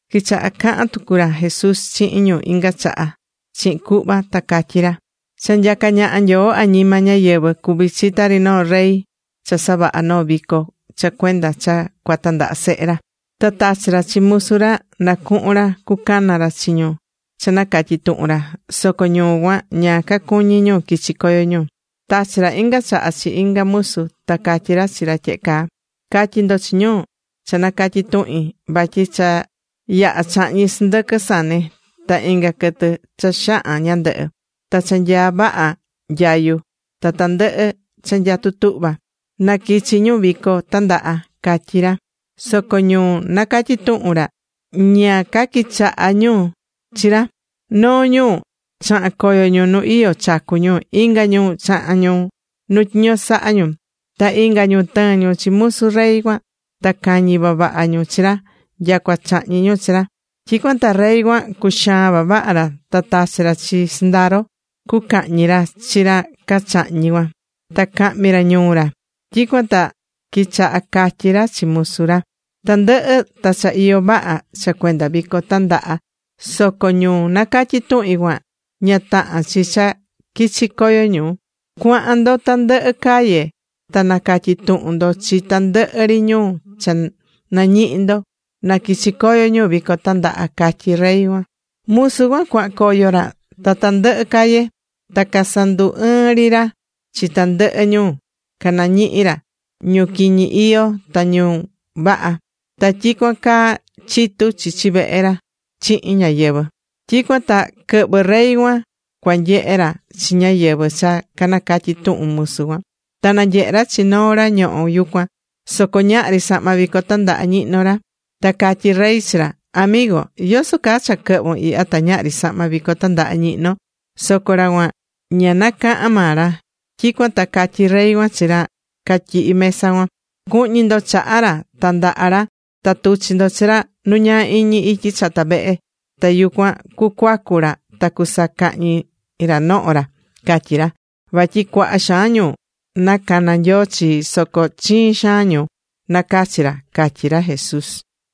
Quichaha̱ cahan tucu ra Jesús chihin ñu inga chaha chihin cuhva, ta catyí ra: ―Cha nyacá ñaha Nyoo añima ñáyɨvɨ cuví chi tari noo rey cha savaha̱ noo vico cha cuenda cha cua tandaha sehe ra. Ta tachi̱ ra chi musu ra na cuhun ra cucana ra chi ñu cha nacatyi̱ tuhun ra, soco ñu cuan, ña cacuñí ñu quichi coyo ñu. Tachi̱ ra inga chaha chi inga musu, ta catyi̱ ra chi ra tyehe caa: “Ca̱tyi ndo chi ñu cha nacatyi̱ tuhin, vatyi cha yaha̱ chahñi̱ sɨndɨquɨ sane, ta inga quɨtɨ cha xahan ñandɨhɨ, ta cha nyaá vaha nyayu, ta tandɨhɨ cha nyatú tuhva. Na quichi ñu vico tandaha”, catyí ra. Soco ñu nacatyi̱ tuhun ra, ña caquichaha̱ ñu chi ra. Noo ñu chaha̱n coyo ñu nu iyó chacu ñu, inga ñu chaha̱n ñu nu tyiño sahá ñu. Ta inga ñu tɨɨ̱n ñu chi musu rey cuan ta cañi̱ vavaha ñu chi ra nyacua chahñi̱ ñu chi ra. Tyicuan ta rey cuan cuxaa̱n vavaha ra, ta tachi̱ ra chi sɨndaro ra, cucahñi ra chi ra cachahñi̱ cuan, ta cahmi ra ñuu ra. Tyicuan ta quichaha̱ catyí ra chi musu ra: “Tandɨhɨ ta cha iyó vaha cha cuenda vico tandaha, soco ñu nacatyi̱ tuhin cuan, ña tahán chi cha quichi coyo ñu. Cua̱han ndo tandɨhɨ calle ta na̱catyi tuhun ndo chi tandɨhɨ ri ñu cha nañihi ndo na quichi coyo ñu vico tandaha”, catyí rey cuan. Musu cuan cuahan coyo ra tandɨhɨ calle, ta casandu ɨɨ̱n ri ra chi tandɨhɨ ñu canañihi̱ ra: ñu quiñi iyó, ta ñu vaha. Ta tyicuan caa chitu chichi vehe ra chihin ñáyɨvɨ. ’Tyicuan ta quɨhvɨ̱ rey cuan cua nyehe ra chi ñáyɨvɨ cha canacatyi̱ tuhun musu cuan. Ta nanyehe̱ ra chi noo ra ñohó yucuan, soco ñahri sahma vico tandaha ñihnó ra. Ta catyí rey chi ra: “Amigo, ¿yoso caa cha quɨhvu̱n ihya ta ñahri sahma vico tandaha ñihnón?” Soco ra cuan ña na caha̱n maa ra. Tyicuan ta catyí rey cuan chi ra catyihí mesa cuan: “Cu̱hñi ndo chaha ra ta ndaha ra, ta tu̱chi ndo chi ra nu ñaa iñi ityi chata vehe, ta yucuan cucuacu ra, ta cusacahñi ra noho ra”, catyí ra. Vatyi cuaha xaan ñu nacana̱ Nyoo chii, soco chiin xaan ñu nacachi ra ―catyí ra Jesús.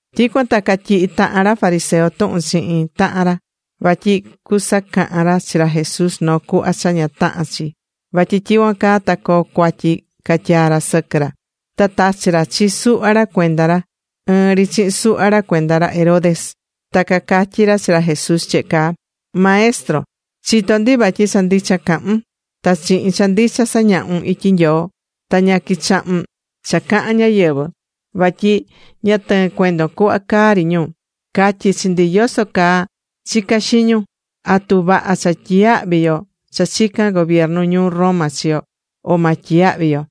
Tyicuan ta catyihi̱ tahan ra fariseo tuhun chihin tahan ra vatyi cusacahan ra chi ra Jesús noo cuhva cha ña tahán chi, vatyi tyicuan caa ta coo cuatyi catyaa ra sɨquɨ ra. Ta tachi̱ ra chi suhva ra cuenda ra, ɨɨn ri chihin suhva ra cuenda ra Herodes. Ta cacatyí ra chi ra Jesús tyehe caa: ―Maestro, chitó ndi vatyi cha ndicha cahún. Ta chihin cha ndicha sañahún ityi Nyoo. Ta ña quichahún cha cahán ñáyɨvɨ, vatyi ña tɨɨ́n cuendon cuhva caá ri ñu. Ca̱tyi chi ndi yoso caa chicá xiñun: ¿Atu vaha cha tyiyahví yo cha chicán gobiernu ñuu Roma chi yo, o ma tyiyahvi yo?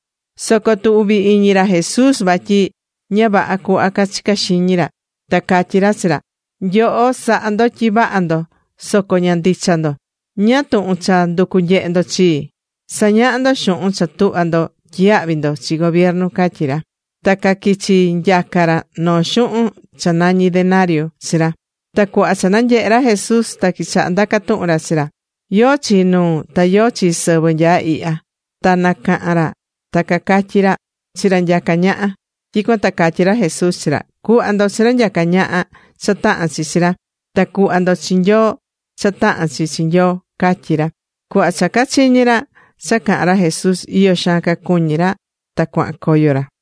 Soco tuvi̱ iñi ra Jesús vatyi ña vaha cuhva cachicá xiñi ra, ta catyí ra chi ra: ―Nyoho sahá ndo tyi vaha ndo, soco ña ndicha ndo. ¿Ñáá tuhun cha nducu nyehe ndo chii? Sa̱ñaha ndo xuhun cha tuhva ndo tyiyahvi ndo chi gobiernu ―catyí ra. Ta caquichi̱ nyaca ra noo xuhun cha nañí denariu chi ra. Ta cuhva cha nanyehe̱ ra Jesús, ta quichaha̱ ndaca tuhun ra chi ra: ―¿Yóó chi nuu ta yóó chi sɨvɨ nyaá ihya? Ta nacaha̱n ra ta cacatyí ra: ―Chi ra nyacá ñaha. Tyicuan ta catyí ra Jesús chi ra: ―Cu̱hva ndo chi ra nyaca ñaha cha tahán chi chi ra, ta cu̱hva tucu ndo chi Nyoo cha tahán chi chi Nyoo ―catyí ra. Cuhva cha cachiñi̱ ra cha caha̱n ra Jesús, iyo xaan cacuñi̱ ra. Ta cuahan coyo ra.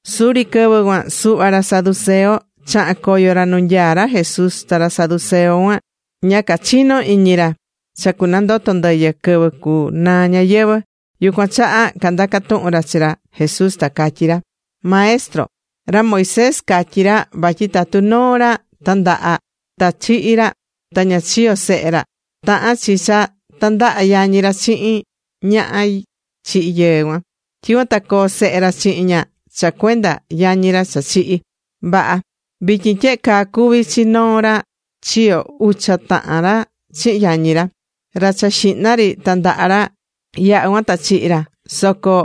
Suri quɨvɨ cuan suhva ra saduceo chaha̱n coyo ra nu nyaá ra Jesús. Ta ra saduceo cuan ña cachino iñi ra cha cunandoto ndɨyɨ quɨvɨ cu naa ñayɨvɨ̱. Yucuan chaha candaca̱ tuhun ra chi ra Jesús, ta catyí ra: ―Maestro, ra Moisés catyi̱ ra vatyi tatu noo ra tandaha̱ ta chihi̱ ra ta ña chiyo̱ sehe ra, tahán chi cha tandaha yañi ra chihin ñaha chihi̱ yɨɨ cuan. Tyicuan ta coo sehe ra chihin ña cha cuenda yañi ra cha chihi̱. Vaha. Vityin tyehe caa cuvi̱ chi noo ra chiyo ucha tahan ra chihin yañi ra. Ra cha xihna ri tandaha̱ ra. Yaha̱ cuan ta chihi̱ ra. Soco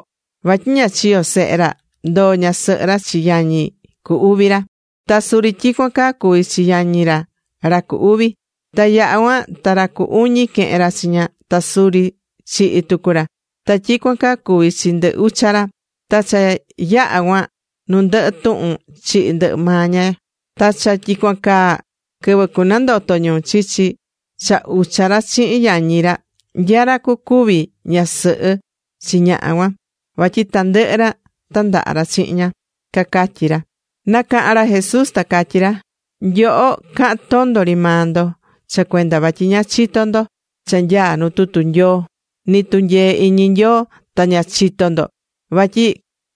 vatyi ña chiyo̱ sehe ra, ndoo ñasɨhɨ ra chi yañi cu uvi ra. Ta suri tyicuan caa cuvi̱ chi yañi ra ra cu uvi. Ta yaha̱ cuan, ta ra cu uñi quehen ra chi ña, ta suri chihi̱ tucu ra. Ta tyicuan caa cuvi̱ chi ndɨ ucha ra. Ta cha yaha̱ cuan nu ndɨhɨ tuhun chihi̱ ndɨhɨ maa ña cuan. Ta cha tyicuan caa, quɨvɨ cunandoto ñu, chichi cha ucha ra chihin yañi ra, ¿nya ra cucuvi ñasɨhɨ chi ñaha cuan? ¿Vatyi tandɨhɨ ra tandaha ra chihin ña? ―cacatyí ra. Nacaha̱n ra Jesús ta catyí ra: ―Nyoho, cahán tondo ri maa ndo, cha cuenda vatyi ña chitó ndo cha nyaá nu tutu Nyoo, ni tunyee iñi Nyoo, ta ña chitó ndo. Vatyi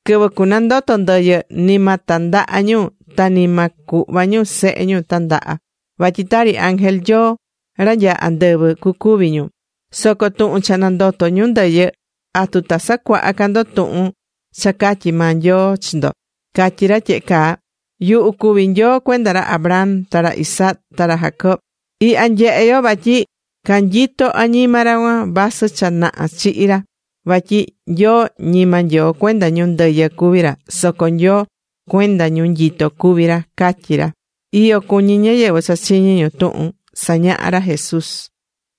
quɨvɨ cunandoto ndɨyɨ, ni ma tandaha ñu, ta ni ma cuhva ñu sehe ñu tandaha, vatyi tari ángel Nyoo ra nyaá andɨvɨ cucuvi ñu. Soco tuhun cha nandotó ñu ndɨyɨ, ¿atu ta sacuaha ca ndo tuhun cha catyi̱ maa Nyoo chi ndo? Catyí ra tyehe caa: “Yuhu cuví Nyoo cuenda ra Abraham, ta ra Isaac ta ra Jacob.” Ihya nyehé yo vatyi canyito añima ra cuan, vasɨ cha naha chihi̱ ra vatyi Nyoo ñima Nyoo cuenda ñu ndɨyɨ cuví ra, soco Nyoo cuenda ñu nyitó cuví ra ―catyí ra. Iyo cuñí ñáyɨvɨ cha chiñi̱ ñu tuhun sañahá ra Jesús.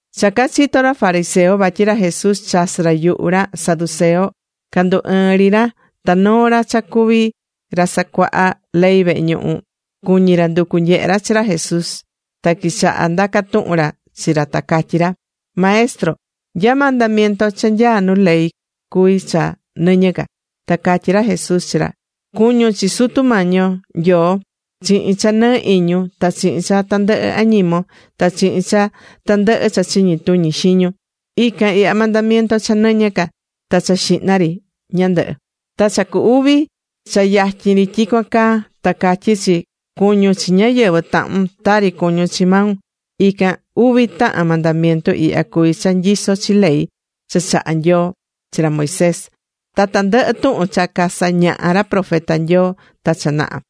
Cha cachito̱ ra fariseo vatyi ra Jesús chasɨ̱ ra yuhu ra saduceo, candu ɨɨ̱n ri ra. Ta noo ra cha cuví ra sacuahá ley vehe ñuhu, cuñi̱ ra nducu nyehe ra chi ra Jesús. Ta quichaha ndaca tuhun ra chi ra, ta catyí ra: ―Maestro, ¿nya mandamiento cha nyaa nu ley cuví cha nɨñɨ ca? Ta catyí ra Jesús chi ra: ―“Cu̱ñun chi Sutu Mañi yo Nyoo chihin cha nɨɨ iñun ta chihin cha tandɨhɨ añimon, ta chihin cha tandɨhɨ cha chiñi tuñi xiñun.” Ican ihya mandamiento cha nɨñɨ ca, ta cha xihna ri ñandɨhɨ. Ta cha cu uvi cha yatyin ri tyicuan caa, ta catyí chi: “Cu̱ñun chi ñáyɨvɨ tahun tari cuñún chi maun.” Ican uvi tahan mandamiento ihya cuví cha nyisó chi ley cha chaha̱ Nyoo chi ra Moisés ta tandɨhɨ tuhun cha casañaha̱ ra profeta Nyoo ta cha naha.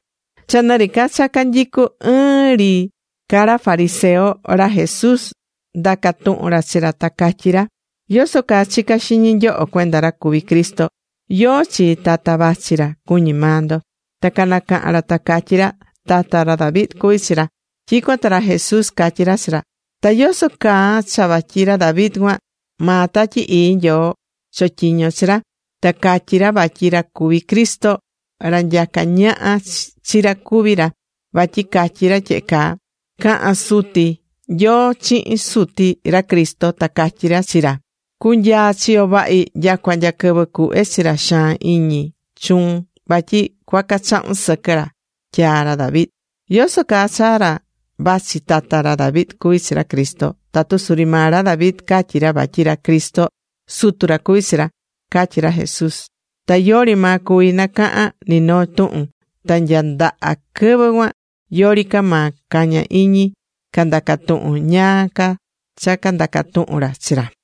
Cha nɨ ri ca cha canyicú ɨɨn ri ca ra fariseo, ra Jesús ndaca̱ tuhun ra chi ra, ta catyí ra: ―¿Yoso caa chicá xiñi nyoho cuenda ra cuví Cristo? ¿Yóó chi tata vachi ra cuñí maa ndo? Ta canacaha̱n ra ta catyí ra: ―Tata ra David cuví chi ra. Tyicuan ta ra Jesús catyí ra chi ra: ―¿Ta yoso caa cha vatyi ra David cuan, maa Tatyi Ii Nyoo chotyiño̱ chi ra? ta catyi̱ ra vatyi ra cuví Cristo, ra nyacá ñaha chi ra cuví ra, vatyi catyi̱ ra tyehe caa: Caha̱n Suti Nyoo chihin Suti ra Cristo, ta catyí ra chi ra: “Cu̱nyaa chiyo vahi nyacua nya quɨvɨ cuhve chi ra xaan iñi chuun vatyi cuaca chahun sɨquɨ ra” tyaa̱ ra David. ¿Yoso caa cha ra vachi tata ra David cuví chi ra Cristo, tatu suri maa ra David catyi̱ ra vatyi ra Cristo Sutu ra cuví chi ra? ―catyí ra Jesús. Ta yori maa cuvi̱ nacaha̱n ni noo tuhun. Ta nya ndaha quɨvɨ cuan, yori ca maa caña̱ iñi candaca tuhun ñáá ca cha candaca tuhun chi ra.